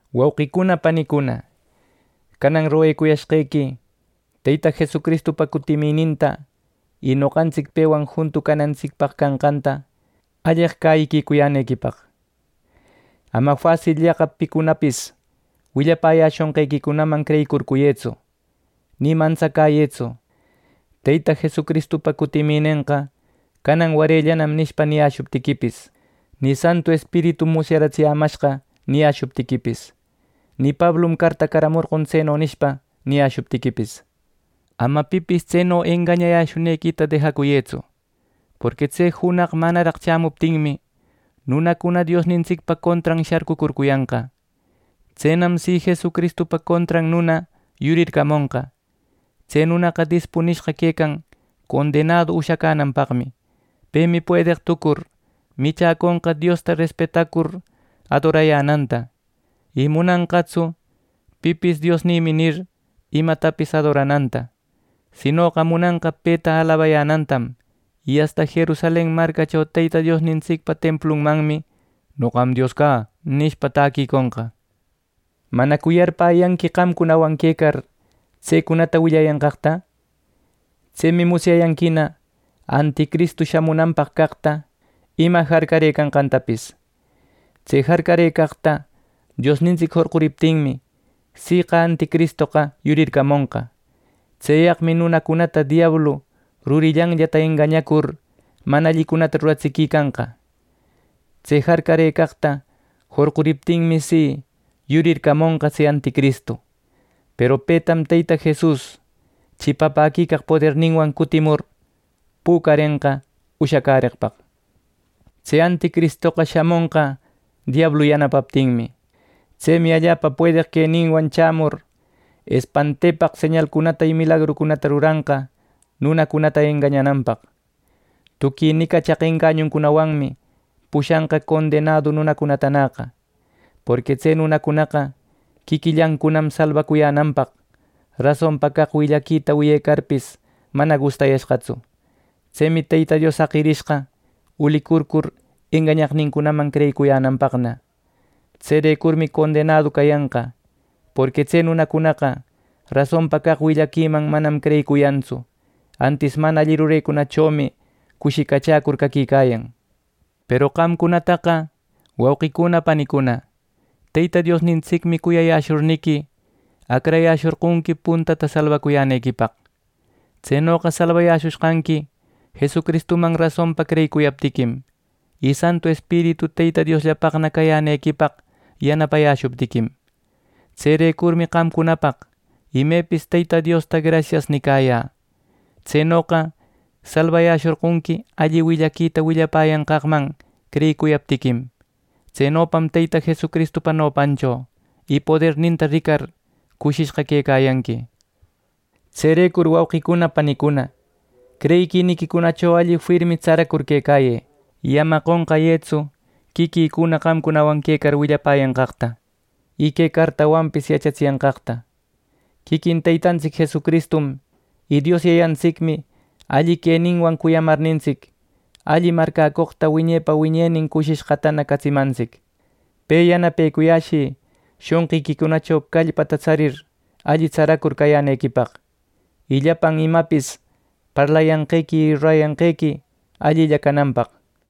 Wauqicuna panicuna, canan roguecuyashqequi Teyta Jesucristupa cutimininta y noqantsic pewan juntu canantsicpaq canqanta alleq cäyicuyänequipaq. Ama fasilllaqa picunapis willapäyäshonqequicunaman creyicurcuyëtsu, ni mantsacäyëtsu: “Teyta Jesucristupa cutiminenqa canan warellanan” nishpa, niyäshuptiquipis, ni “Santu Espiritum musyaratsimashqa” niyäshuptiquipis, ni “Pablum cartacamorqon tseno” nishpa, niyäshuptiquipis. Ama pipis tseno engañayäshunequita dejacuyëtsu, porqui tse junaq manaraq chämuptinmi, nunacuna Diosnintsicpa contran sharcucurcuyanqa. Tsenam si Jesucristupa contran nuna yurircamonqa. Tse nunaqa dispunishqa quecan condenadu ushacänanpaqmi. Pemi puedeq tucur michäconqa Diosta respetacur adorayänanta y munanqatsu pipis “Diosnïmi” nir, imatapis adorananta, sinoqa munanqa peta alabayänantam, y asta Jerusalen marcacho Teyta Diosnintsicpa templunmanmi “Noqam cä Dios” nishpa, täquiconqa. ¿Manacu yarpäyanqui qamcunawan quecar tsecunata willayanqaqta? Tsemi musyayanquina anticristu shamunanpaq caqta ima jarcarëcanqantapis. Tse jarcarëcaqta Diosnintsic jorquriptinmi, siqa anticristoqa yurircamonqa. Tseyaqmi nunacunata diablu rurillanllata engañacur mana allicunata ruratsiquicanqa. Tse jarcarëcaqta jorquriptinmi, si yurircamonqa tse anticristu. Peru petam Teyta Jesus chipapäquicaq poderninwan cutimur pücarenqa ushacäreqpaq. Tse anticristoqa shamonqa diablu yanapaptinmi. Tsemi allapa puedeq queninwan chämur, espantaquipaq señalcunata y milagrucunata ruranqa nunacunata engañananpaq. Tuqui nicachaq engañuncunawanmi pushanqa condenadu nunacunatanäqa, porqui tse nunacunaqa quiquillancunam salbacuyänanpaq, rasonpa caq willaquita wiyecarpis mana gustayashqatsu. Tsemi Teyta Dios jaqirishqa ulicurcur engañaqnincunaman creyicuyänanpaqna. Tserecurmi condenadu cayanqa, porqui tse nunacunaqa rasonpa caq willaquiman manam creyicuyantsu, antis mana alli rurecunachomi cushicachäcur caquicayan. Peru qamcunataqa, wauqicuna panicuna, Teyta Diosnintsicmi cuyayäshurniqui, acrayäshorqonqui puntata salbacuyänequipaq. Tsenoqa salbayäshushqanqui Jesucristuman rasonpa creyicuyaptiquim, y Santu Espiritu Teyta Diosllapaqna cayänequipaq yanapayäshuptiquim. Tserecurmi qamcunapaq imepis Teyta Diosta “Grasias” nicayä. Tsenoqa salbayäshorqonqui alli willaquita willapäyanqaqman creyicuyaptiquim. Tsenopam Teyta Jesucristupa nopancho y poderninta ricar cushishqa quecayanqui. Tserecur, wauqicuna panicuna, creyiquiniquicunacho alli firmi tsaracur quecayë; y ama qonqayëtsu quiquïcuna qamcunawan quecar willapäyanqaqta, y que cartawanpis yachatsiyanqaqta. Quiquin Teytantsic Jesucristum y Dios Yayantsicmi alli queninwan cuyamarnintsic, alli marcäcoqta wiñepa wiñenin cushishqata catsimantsic. Pe yanapecuyäshï shonqiquicunacho callpata tsarir alli tsaracur cayänequipaq, y llapan imapis parlayanqequi y rurayanqequi allilla cananpaq.